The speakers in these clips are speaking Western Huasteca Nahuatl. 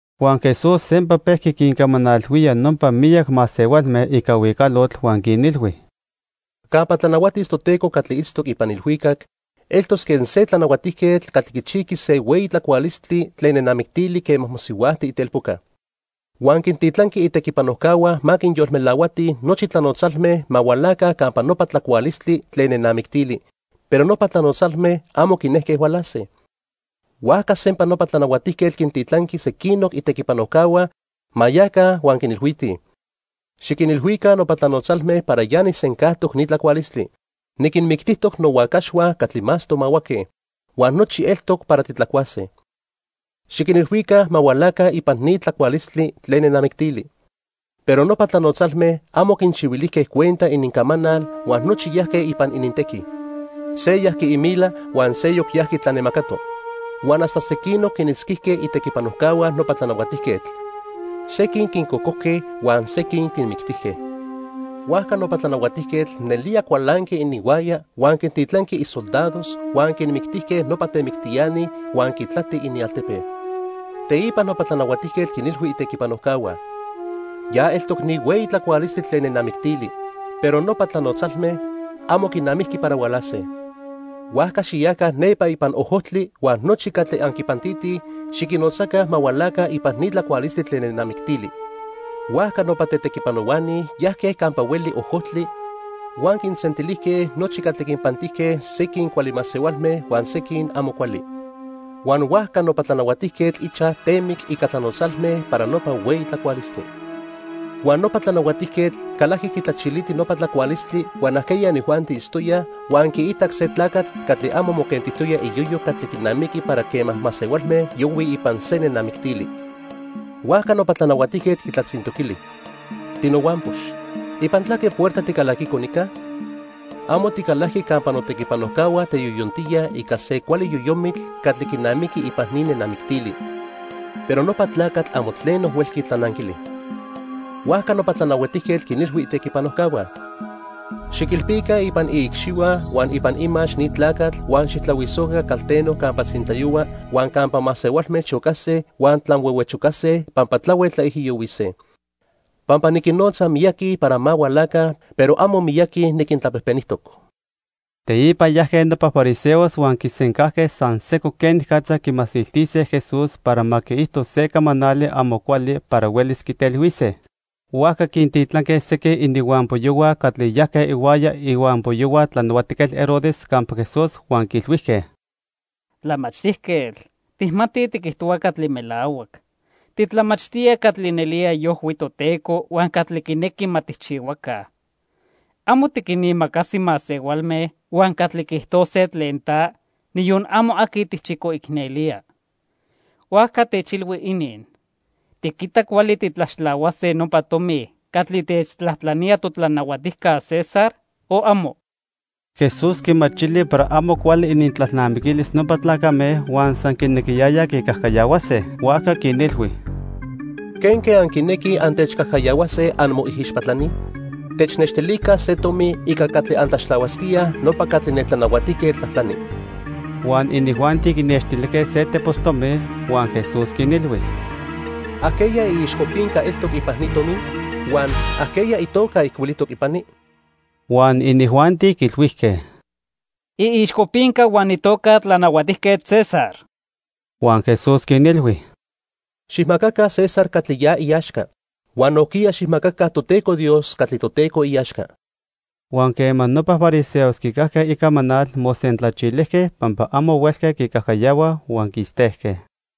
Huan Jesús sempa pejqui quincamanalhuía nopa miyac masehualme ica huicalotl huan quinilhui: "Campa tlanahuatis Toteco catli itztoc ipan ilhuicac, eltos quen se tlanahuatijquetl catli quichijqui se hueyi tlacualistli tlen nenamictili quema mosihuajti itelpoca. Huan quintitlanqui itequipanojcahua ma quinyolmelahuatij nochi tlanotzalme ma hualaca campa nopa tlacualistli tlen nenamictili, pero nopa tlanotzalme amo quinejque hualase. "Huajca sempa nopa tlanahuatijquetl quintitlanqui sequinoc itequipanojcahua ma yaca huan quinilhuitij: 'Xiquinilhuica nopa tlanotzalme para ya nijsencajtoc ni tlacualistli. Niquinmictijtoc nohuacaxhua catli más tomahuaque, huan nochi eltoc para titlacuase. Xiquinilhuica ma hualaca ipan ni tlacualistli tlen nenamictili.' Pero nopa tlanotzalme amo quinchihuilijque cuenta inincamanal huan nochi yajque ipan inintequi. Se yajqui imila huan seyoc yajqui tlanemacato. Huan hasta sequinoc quinitzquijque itequipanojcahua nopa tlanahuatijquetl. Sequin quincocojque huan sequin quinmictijque. Huajca nopa tlanahuatijquetl nelía cualanqui ininhuaya huan quintitlanqui isoldados huan quinmictijque nopa temictiani huan quitlati inialtepe. "Teipa nopa tlanahuatijquetl quinilhui itequipanojcahua: 'Ya eltoc ni hueyi tlacualistli tlen nenamictili, pero nopa tlanotzalme amo quinamiqui para hualase. Huajca xiyaca nepa ipan ojojtli huan nochi catli anquinpantitij, xiquinnotzaca ma hualaca ipan ni tlacualistli tlen nenamictili.' Huajca nopa tetequipanohuani yajque campa hueli ojojtli huan quinsentilijque nochi catli quinpantijque, sequin cuali masehualme huan sequin amo cuali. Huan huajca nopa tlanahuatijquetl ichaj temic ica tlanotzalme para nopa hueyi tlacualistli. "Huan nopa tlanahuatijquetl calajqui quitlachiliti nopa tlacualistli huan ajqueya inijuanti itztoyaj, huan quiitac se tlacatl catli amo moquentijtoya iyoyo catli quinamiqui para quema masehualme yohuij ipan se nenamictili. Huajca nopa tlanahuatijquetl quitlatzintoquili: 'Tinohuampox, ¿ipan tlaque puerta ticalaquico nica? Amo ticalajqui campa notequipanojcahua teyoyontíaj ica se cuali yoyomitl catli quinamiqui ipan ni nenamictili.' Pero nopa tlacatl amo tleno huelqui tlananquili. Huajca nopa tlanahuatijquetl quinilhui itequipanojcahua: 'Xiquilpica ipan iicxihua huan ipan imax ni tlacatl huan xijtlahuisoca calteno campa tzintlayohua huan campa masehualme chocase huan tlanhuehuechocase pampa tlahuel tlaijiyohuise.' Pampa niquinnotza miyaqui para ma hualaca, pero amo miyaqui niquintlapejpenijtoc." Teipa yajque nopa fariseos huan quisencajque san sejco quenicatza quimasiltise Jesús para ma quiijto se camanali amo cuali para huelis quitelhuise. Huajca quintitlanque sequin ininhuampoyohua catli yajque ihuaya ihuampoyohua Tlanahuatijquetl Herodes campa Jesús huan quiilhuijque: —Tlamachtijquetl, tijmatij tiquijtohua catli melahuac. Titlamachtía catli nelía iojhui Toteco huan catli quinequi ma tijchihuaca. Amo tiquinimacasi masehualme huan catli quiijtose tlen ta, niyon amo aqui tijchicoicnelía. Huajca techilhui inin. ¿Tiquita cuali titlaxtlahuase nopa tomi catli techtlajtlanía totlanahuatijca César, o amo? Jesús quimachili para amo cuali inintlalnamiquilis nopa tlacame huan san quinequiyayaj quicajcayahuase. Huajca quinilhui: —¿Quenque anquinequij antechcajcayahuase, anmoijixpatlani? Technextilica se tomi ica catli antlaxtlahuasquíaj nopa catli ne tlanahuatijquetl tlajtlani. Huan inijuanti quinextilijque se tepos tomi. Huan Jesús quinilhui: —¿Ajqueya iixcopinca eltoc ipan ni tomi? Huan ¿ajqueya itoca ijcuilijtoc ipani? Huan inijuanti quiilhuijque: —Iixcopinca huan itoca tlanahuatijquetl César. Huan Jesús quinilhui: —Xijmacaca César catli ya iaxca huan nojquiya xijmacaca Toteco Dios catli Toteco iaxca. Huan quema nopa fariseos quicajque icamanal, mosentlachilijque pampa amo huelque quicajcayahuaj huan quistejque.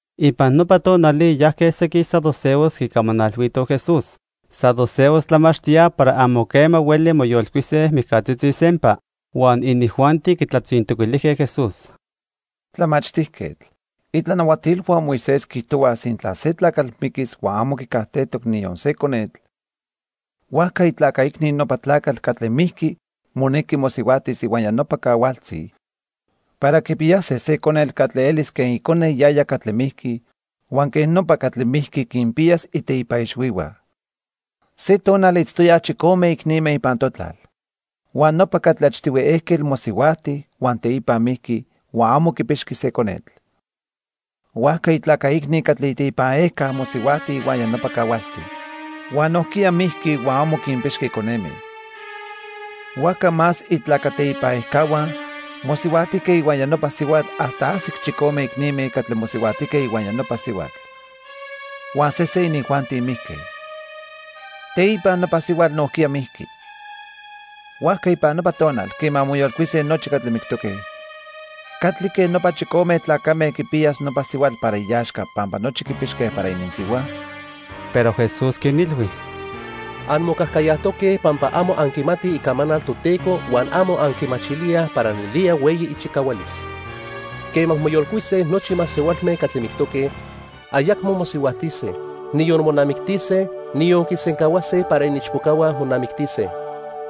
Ipan nopa tonali yajque sequin saduceos quicamanalhuitoj Jesús. Saduceos tlamachtíaj para amo quema hueli moyolcuise mijcatzitzi sempa. Huan inijuanti quitlatzintoquilijque Jesús: —Tlamachtijquetl, itlanahuatilhua Moisés quiijtohuaj sintla se tlacatl miquis huan amo quicajtejtoc niyon se conetl, huajca itlaca icni nopa tlacatl catli mijqui monequi mosihuajtis ihuaya nopa cahualtzi para quipiyase se conetl catli elis quen icone yaya catli mijqui huan quej nopa catli mijqui quinpiyas iteipa ixhuihua. Se tonal itztoyaj chicome icnime ipan totlal, huan nopa catli achtihui ejquetl mosihuajti huan teipa mijqui huan amo quipixqui se conetl. Huajca itlaca icni catli iteipan ejca mosihuajti ihuaya nopa cahualtzi. Huan nojquiya mijqui huan amo quipixqui coneme. Huajca más itlaca teipan ejcahua mosihuajtijque ihuaya nopa sihuatl hasta ajsic chicome icnime catli mosihuajtijque ihuaya nopa sihuatl; huan sesen inijuanti mijque. Teipa nopa sihuatl nojquiya mijqui. Huajca ipan nopa tonal quema moyolcuise nochi catli mictoque, ¿catlique nopa chicome tlacame quipiyas nopa sihuatl para iaxca pampa nochi quipixque para ininsihua? Pero Jesús quinilhui: —Anmocajcayajtoque pampa amo anquimatij Icamanal Toteco huan amo anquimachilíaj para nelía hueyi ichicahualis. Quema moyolcuise nochi masehualme catli mictoque, ayacmo mosihuajtise, niyon monamictise, niyon quisencahuase para iniichpocahua monamictise.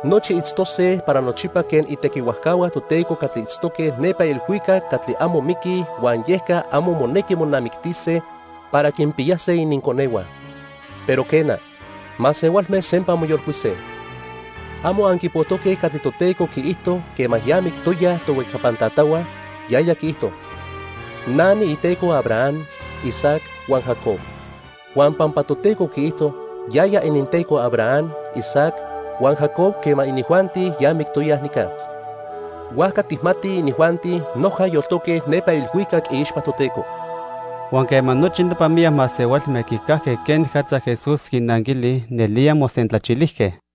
Nochi itztose para nochipa quen itequihuajcahua Toteco catli itztoque nepa ilhuicac catli amo miquij huan yeca amo monequi monamictise para quinpiyase ininconehua. Pero quena, masehualme sempa moyolcuise. ¿Amo anquipojtoque catli Toteco quiijto quema ya mictoyaj tohuejcapan tatahua? Yaya quiijto: 'Na niiTeco Abraham, Isaac huan Jacob.' Huan pampa Toteco quiijto yaya ininTeco Abraham, Isaac huan Jacob quema inijuanti ya mictoyaj nica, huajca tijmatij inijuanti noja yoltoque nepa ilhuicac iixpa Toteco. Huan quema nochi nopa miyac masehualme quicajque quenicatza Jesús quinnanquili, nelía mosentlachilijque.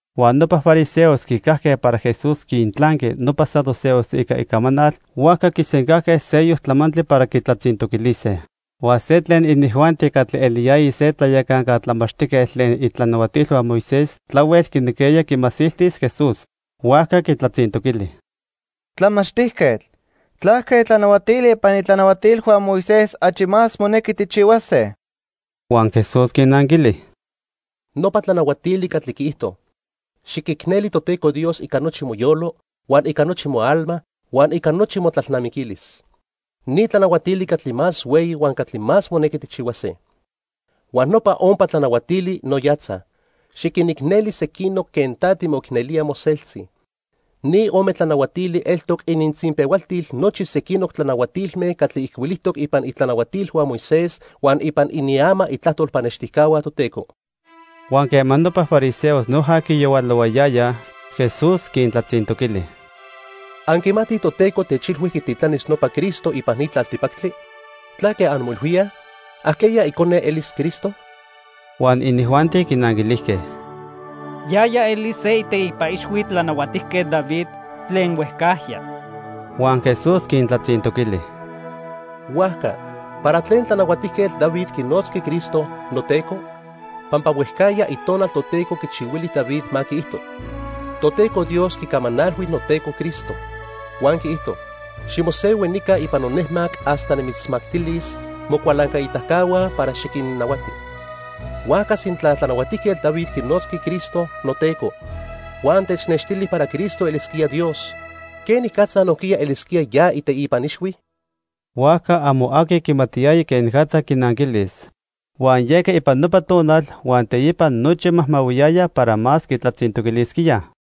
Huan nopa fariseos quicajque para Jesús quintlanqui nopa saduceos ica icamanal, huajca quisencajque seyoc tlamantli para quitlatzintoquilise. Huan se tlen inijuanti catli eliyaya se tlayacanca tlamachtijquetl tlen itlanahuatilhua Moisés tlahuel quinequiyaya quimasiltis Jesús. Huajca quitlatzintoquili: —Tlamachtijquetl, ¿tlaque tlanahuatili ipan itlanahuatilhua Moisés achi más monequi tijchihuase? Huan Jesús quinanquili: —Nopa tlanahuatili catli quiijto: 'Xiquicneli Toteco Dios ica nochi moyolo, huan ica nochi moalma, huan ica nochi motlalnamiquilis.' Ni tlanahuatili catli más hueyi huan catli más monequi tijchihuase. Huan nopa ompa tlanahuatili no yatzaj: 'Xiquinicneli sequinoc quen ta timoicnelía moseltzi.' Ni ome tlanahuatili eltoc inintzinpehualtil nochi sequinoc tlanahuatilme catli ijcuilijtoc ipan itlanahuatilhua Moisés huan ipan iniama itlajtol pannextijcahua Toteco. Huan quema nopa fariseos noja quiyahualohuayaya, Jesús quintlatzintoquili: —Anquimatij Toteco techilhui quititlanis nopa Cristo ipan ni tlaltipactli. ¿Tlaque anmoilhuíaj? ¿Ajqueya icone elis Cristo? Huan inijuanti quinanquilijque: —Yaya elis se iteipa ixhui Tlanahuatijquetl David tlen huejcajya. Huan Jesús quintlatzintoquili: —Huajca, ¿para tlen Tlanahuatijquetl David quinotzqui Cristo 'noTeco'? Pampa huejcajya Itonal Toteco quichihuili David ma quiijto: 'Toteco Dios quicamanalhui noTeco Cristo, huan quiijto: Ximosehui nica ipan nonejmac hasta nimitzmactilis mocualancaitacahua para xiquinnahuati.' Huajca sintla Tlanahuatijquetl David quinotzqui Cristo 'noTeco' huan technextili para Cristo elisquía Dios, ¿quenicatza nojquiya elisquía ya iteipa ixhui? Huajca amo aqui quimatiyaya quenicatza quinanquilis. Huan yeca ipan nopa tonal huan teipa nochi majmahuiyayaj para más quitlatzintoquilisquíaj.